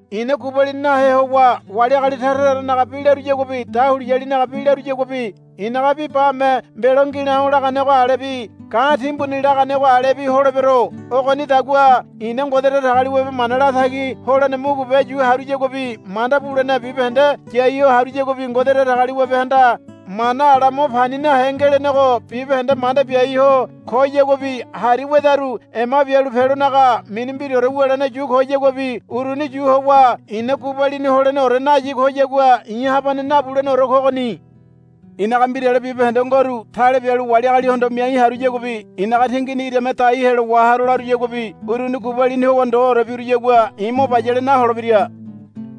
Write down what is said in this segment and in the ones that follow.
I̱na gubalini nahe howa wali agali tara taranaga bi laruyaguabi dahuliyalinaga bi laruyaguabi i̱naga bi bame mbelo ngi̱la̱o̱ laganego alebi ga̱ timbuni laganego alebi holebero. Ogonidagua i̱na Ngode Datagaliwabe mana latagi holene mugube yu haruyaguabi manda bulene bibahende yai ho haruyaguabi Ngode Datagaliwabehanda mana ala mo pani nahe ngelenego bibahende manda biai ho koyaguabi hari wedaru ema bialu pelonaga mini mbiraore wulene yu koyaguabi uruni yu howa i̱na gubalini holeneore nayi koyagua i̱ habane nabuleneore kogoni. I̱naga mbirale bibahende ngoru tale bialu wali agalihondo miai haruyaguabi i̱naga tingini irame dai helo waharo laruyaguabi uruni gubalini howa ndoore biruyagua i̱ mo bayale naholebira.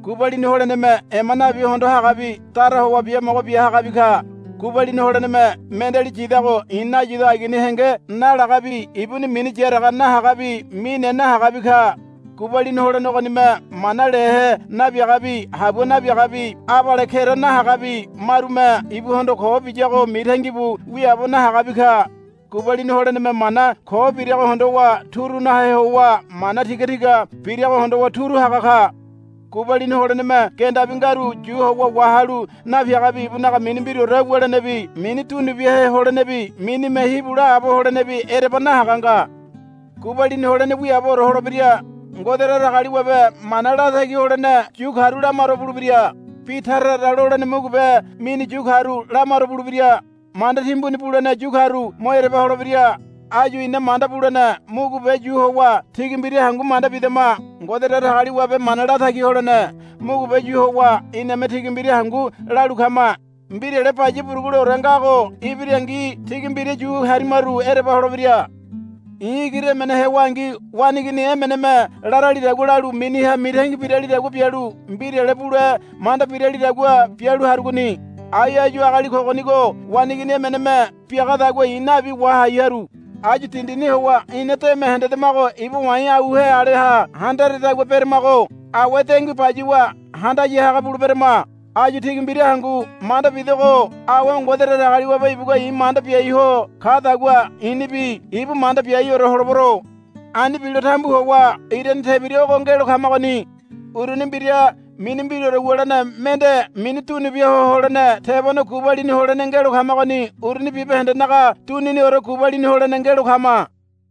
Gubalini holeneme ema nabi hondo hagabi dara howa biamogo bia hagabi ka. Gubalini holeneme mendeali yidago i̱ nayido agini henge nalagabi ibuni mini yaraga nahagabi mine nahagabi ka. Gubalini holene ogonime mana lehe nabiagabi habua nabiagabi abale kera nahagabi marume ibuhondo ko biyago mitangi bu wiaabo nahagabi ka. Gubalini holeneme mana ko birago hondowa turu nahe howa mana tiga tiga birago hondowa turu haga ka. Gubalini holeneme gendabi ngaru yu howa wahalu napiagabi ibunaga mini mbiraore wulenebi mini dunu biahe holenebi minime hibu laabo holenebi ereba nahaga nga. Gubalini holene wiaabore holebira. Ngode Datagaliwabe mana latagi holene yu karu lamaro bulebira. Bi tara tara lolene mugube mini yu karu lamaro bulebira. Manda timbuni bulene yu karu mo ereba holebira. Áyu ina manda bulene mugube yu howa tigi mbira hangu manda bidama. Ngode Datagaliwabe mana latagi holene mugube yu howa iname tigi mbira hangu lalu kama. Mbirale baya buruguleore ngago ibirangi tigi mbira yu harimaru ereba holebira. I̱ igiri emene hewangi waneigini emeneme laralidagua lalu miniha mitangi biralidagua bialu mbirale bule manda biralidagua bialu harugoni. Ai áyu agali kogonigo waneigini emeneme biagadagua i̱ nabi wahai haru. Áyu dindini howa ina deme hendedamago iba wa̱i̱ auhe aleha handaredagua beramago. Awe dengui bayuwa handaya haga buleberama. Áyu tigi mbira hangu manda bidogo awe Ngode Datagaliwabe ibugua i̱ manda biai ho kadagua i̱nibi ibu manda biaiore holebero. Ani bilo tambu howa irane tebira ogo ngelo kamagoni. Uruni mbira mini mbiraore wulene mende mini dunu bia ho holene tebone gubalini holene ngelo kamagoni. Uruni bibahendenaga duniniore gubalini holene ngelo kama.